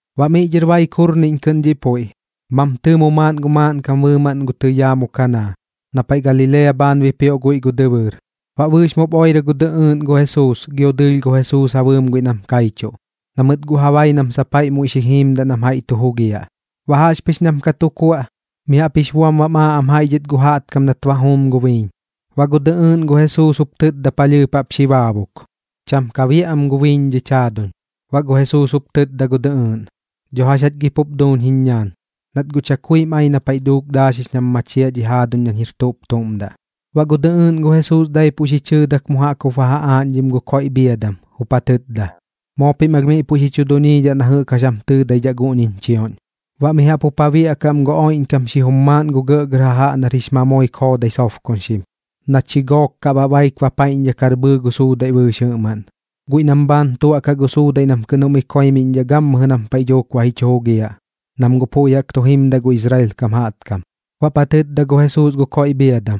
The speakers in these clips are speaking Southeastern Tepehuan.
Baꞌ miꞌ dhɨr baik jurniꞌñ kɨꞌn dhiꞌ puiꞌ, mam tɨɨmo maaꞌn gu maaꞌnkam bɨɨmaꞌn gu tɨyaa mu Kanaa, na paiꞌ Galilea bhaan bipioꞌ guiꞌ gu dɨbɨɨr. Baꞌ bɨɨx mup oirɨ gu dɨꞌɨɨꞌn gu Jesuus gio dɨɨlh gu Jesuus ja bɨɨm guiꞌ nam kaichuꞌ, na mɨt guꞌ ja bai nam sap jaiꞌ muiꞌ xi jiimdaꞌ nam jaiꞌ tu jugiaꞌ. Baꞌ jaꞌxpɨx nam ka tu kuaꞌ, mi jaꞌp jix buam bam aaꞌ am jaiꞌ dhɨt gu jaꞌtkam nat ba juum gu biiñ. Baꞌ gu dɨꞌɨɨꞌn gu Jesuus jup tɨtda palhɨɨp jaꞌp xi baabuk: ―Cham ka biaꞌ am gu biiñ dhich jaaduñ. Baꞌ gu Jesuus jup tɨtda gu dɨꞌɨɨꞌn: ―Dho jax jach gi pup duuñ jiñ ñaan, nat guꞌ chakuim ai na paiꞌ dhuuk daaxix nam machiaꞌ dhi jaaduñ nañ jir tuꞌp tuꞌm daꞌ. Baꞌ gu dɨꞌɨɨꞌn gu Jesuus daipuꞌ xi chɨɨdak mu jaꞌk jup ba ja aaꞌñdhim gu koiꞌ bhiadam, jup ja tɨtda: ―Moo pim alh miꞌ puiꞌ xi chu duñiidhaꞌ na jɨꞌk jax jam tɨɨdaidhaꞌ guꞌñiñ chioꞌñ. Baꞌ mi jaꞌp jup ja biaꞌkaꞌ am gu oiꞌñkam xijum maaꞌn gu gɇꞌgɇr jajaꞌ nar jix mamoik joodai sobkoñxim, na chi gook kaꞌ baꞌ baik bapaiꞌñdhakar bhɨɨ gu suudaiꞌ bɨɨx jɨꞌmaꞌn, guiꞌ nam bhaan tuaꞌkaꞌ gu suudaiꞌ nam kɨꞌn jum ikoimiꞌñdhaꞌ gammɨjɨ nam paiꞌ dhuuk ba ji chu jugiaꞌ, nam guꞌ puiꞌ jaꞌk tu jimdaꞌ gu Israel kam jaꞌtkam. Baꞌp ja tɨtda gu Jesuus gu koiꞌ bhiadam: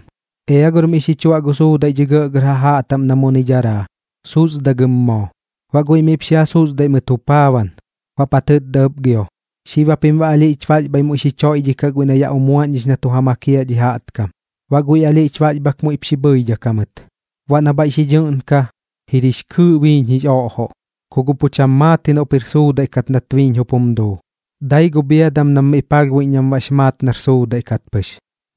―Ea gor miꞌ xi chuaꞌ gu suudaiꞌ dhi gɇꞌgɇr jajaꞌ taꞌm na muni daraa, susdagɨm moo. Baꞌ guiꞌ miꞌp xi ja susduiꞌ mɨt jupaaban. Baꞌp ja tɨtda ɨp gio: ―Xib japim baꞌ alhiꞌch baxbhai muiꞌ xi choiꞌdhikaꞌ guiꞌ na yaꞌ umuaꞌñdhix na tu ja makiaꞌ dhi jaꞌtkam. Baꞌ guiꞌ alhiꞌch baxbhak muiꞌp xi bhɨidhak jamɨt. Baꞌ na bhaiꞌ xi dhɨꞌnka, jir jix kɨɨꞌ biiñ jix oꞌjoꞌ. Ku guꞌ pu cham maat ji noꞌp jir suudaiꞌ kat nat biiñ jup jum duu, dai gu bhiadam nam miꞌ palhbuiꞌñ nam baꞌx maat nar suudaiꞌ kat pɨx,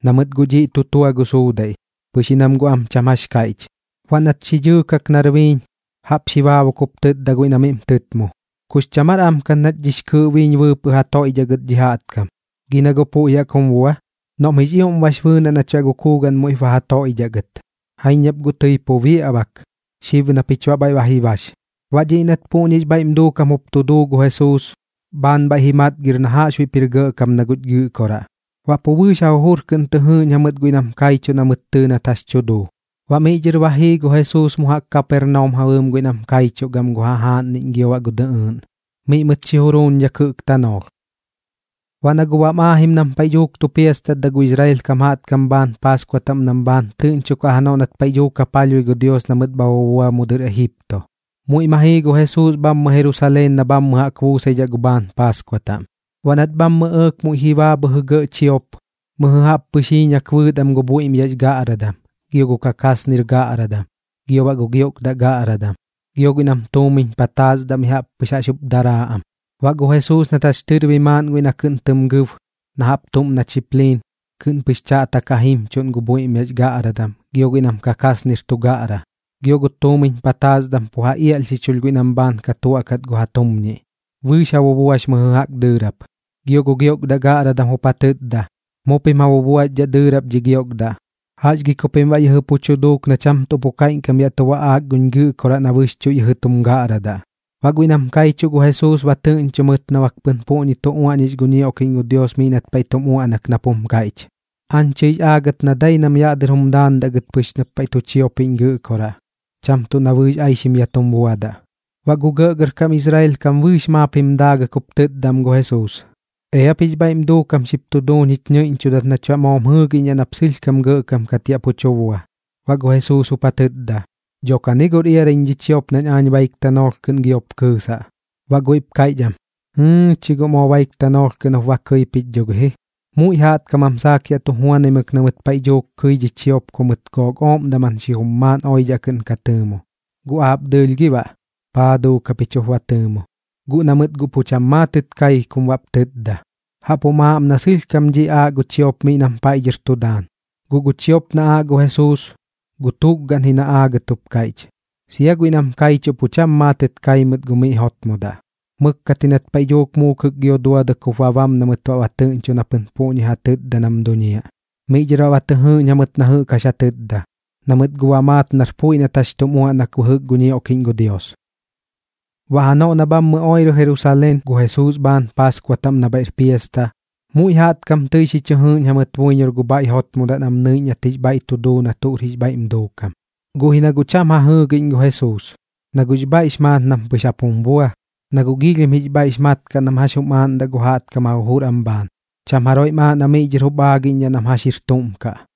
na mɨt guꞌ dhiꞌ tu tua gu suudaiꞌ, pɨx ji nam guꞌ am cham jax kaiꞌch. Baꞌ nat xi dhɨɨkak nar biiñ, jaꞌp xi baabuk jup tɨtda guiꞌ na miꞌm tɨtmu: ―¿Kux cham aar am kat nach dhiꞌñix kɨɨꞌ biiñ bɨɨpɨꞌ ja toiꞌdhaꞌ gɨt dhi jaꞌtkam? Gi na guꞌ puiꞌ jaꞌk jum bua. Noꞌm jix ioꞌm bax bɨɨnaꞌ nach baꞌ gu kuugaꞌn muiꞌp ba ja toiꞌdhaꞌ gɨt. Jaiñ nap guꞌ tɨi pu biaꞌ bak, xib na pich baꞌ bhaiꞌ ba ji bax. Baꞌ dhiꞌ nat puꞌñix bhaiꞌm duukam jup tu duu gu Jesuus, bhaan bhaiꞌ ji matgir na jaꞌxbuiꞌp jir gɇꞌkam na guch Gɨꞌkoraꞌ. Baꞌ pu bɨɨx ja jujur kɨꞌn tɨ jɨɨꞌñ jamɨt guiꞌ nam kaichuꞌ na mɨt tɨɨ nat jax tu duu. Baꞌ miꞌ dhɨr ba jii gu Jesuus mu jaꞌk Kapernaum ja bɨɨm guiꞌ nam kaichuꞌ gam gu jajaaꞌnniꞌñ gio baꞌ gu dɨꞌɨɨꞌn, miꞌ mɨt xi juruuñdhak jɨꞌk tanoolh. Baꞌ na guꞌ bam aajim nam paiꞌ dhuuk tu piastatdaꞌ gu Israel kam jaꞌtkam bhaan paaskua taꞌm nam bhaan tɨꞌñchokaꞌ janoꞌ nat paiꞌ dhuuk ja palhbui gu Dios na mɨt bha bubua mu dɨr Ejipto, muiꞌ ma jii gu Jesuus bhammɨ Jerusaleen na bhammɨ jaꞌk buusaidhaꞌ gu bhaan Paaskua taꞌm. Baꞌ nat bhammɨ ɇɇk muiꞌ ji baa bhɨjɨ gɇꞌ chiop, mɨjɨ jaꞌp pɨx jiiñak bɨɨt am gu bhuiꞌmyax gaꞌradam, gio gu kakasnir gaꞌradam, gio baꞌ gu giokdaꞌ gaꞌradam. Gio guiꞌ nam tuumiñ pataasdaꞌ mi jaꞌp pɨx jax jup daraa am. Baꞌ gu Jesuus nat jax tɨrbi maaꞌn guiꞌ na kɨꞌn tɨm gɨb na jaꞌp tuꞌm na chipliiñ, kɨꞌn pɨx chaꞌtak ja jimchuꞌn gu bhuiꞌmyax gaꞌradam gio guiꞌ nam kakasnir tu gaꞌra. Gio gu tuumiñ pataasdam pu ja iaꞌlhxichulh guiꞌ nam bhaan ka tuaꞌkat gu ja tuumñiꞌ. Bɨɨx ja bubuax mɨjɨ jaꞌk dɨɨrap. Gio gu giokdaꞌ gaꞌradam jup ja tɨtda: ―¡Mu pim ja bubuaxdhaꞌ dɨɨrap dhi giokdaꞌ! ¿Jax gi ku pim baꞌ yɨjɨ pu tu duuk na cham tuꞌ pu kaiꞌñkam yaꞌ tu baꞌaak guñ Gɨꞌkoraꞌ na bɨxchuꞌ yɨjɨ tum gaꞌradaꞌ? Baꞌ guiꞌ nam kaichuꞌ gu Jesuus ba tɨꞌñcho mɨt na bak pɨn puꞌñi tu uaꞌñix gu ñioꞌkiꞌñ gu Dios miꞌ nat paiꞌ tum uaꞌnak nap jum kaiꞌch: “Aañ tɨix aagat na dai nam yaꞌ dɨr jum daandaꞌ gɨt pɨx nap paiꞌ tu chiopiꞌñ Gɨꞌkoraꞌ, cham tuꞌ na bɨɨx aixim yaꞌ tum buadaꞌ.” Baꞌ gu gɇꞌgɇrkam Israel kam bɨɨx maap jim daagɨt jup tɨtda am gu Jesuus: ―Eap jix bhaiꞌm duukam xip tu duuñ jich ñɨiꞌñchudat nach baꞌ moom jɨɨgiꞌñdhaꞌ nap sɨlhkam gɇꞌkam kat yaꞌ pu tu bua. Baꞌ gu Jesuus jup ja tɨtda: ―Dho kani gor iaraiñ dhi chiop nañ aañ baik tanoolh kɨꞌn giop kɨɨsaꞌ. Baꞌ guiꞌp kaiꞌch am: ―¡Jɨɨ chi guꞌ moo baik tanoolh kɨꞌn jup ba kɨi pich dho gi ji! Muiꞌ jaꞌtkam jam saak yaꞌ tu juanaimɨk na mɨt paiꞌ dhuuk kɨi dhi chiop ku mɨt gook ooꞌm daman xijum maaꞌn oidhaꞌ kɨꞌn ka tɨɨmo. Guꞌ aap dɨɨlh gi baꞌ, ¿paa duuk japich jup ba tɨɨmo? Guꞌ na mɨt guꞌ pu cham maatɨt kai kum baꞌp tɨtda. Jaꞌp jum aaꞌ am na sɨlhkam dhiꞌ aaꞌ gu chiop miꞌ nam paiꞌ dhɨr tu daan. Guꞌ gu chiop na aaꞌ gu Jesuus, gu tukgaꞌn ji na aagat jup kaiꞌch. Sia guiꞌ nam kaichuꞌ pu cham maatɨt kai mɨt gu miꞌ jotmodaꞌ. Mɨkkat ji nat paiꞌ dhuuk muukɨk gio duadɨk jup ba bam na mɨt ba tɨꞌñcho na pɨn puꞌñi ja tɨtda nam duñiaꞌ. Miꞌ dhɨr baꞌ ba tɨ jɨɨꞌñ jamɨt na jɨꞌk jax ja tɨtda, na mɨt guꞌ ba maat nar puiꞌ nat jax tum uaꞌnak bɨjɨk gu ñioꞌkiꞌñ gu Dios. Baꞌ janoꞌ na bhammɨ oirɨ Jerusaleen gu Jesuus bhaan Paaskua taꞌm na bhaiꞌr piasta, muiꞌ jaꞌtkam tɨi xi chɨ jɨɨꞌñ jamɨt buiñor gu bhaiꞌ jotmodaꞌ nam nɨiꞌñ nat jix bhaiꞌ tu duu na tuꞌr jix bhaiꞌm duukam. Guꞌ ji na guꞌ cham ja jɨɨgiꞌñ gu Jesuus, na guꞌx bhaiꞌx maat nam pɨx jap jum bua. Na guꞌ giilhim jix bhaiꞌx mat kaꞌ nam jax jum aaꞌndaꞌ gu jaꞌtkam ja jujur am bhaan, cham jaroiꞌm aaꞌ na miꞌ dhɨr jup aagiꞌñdhaꞌ nam jax jir tuꞌm kaꞌ.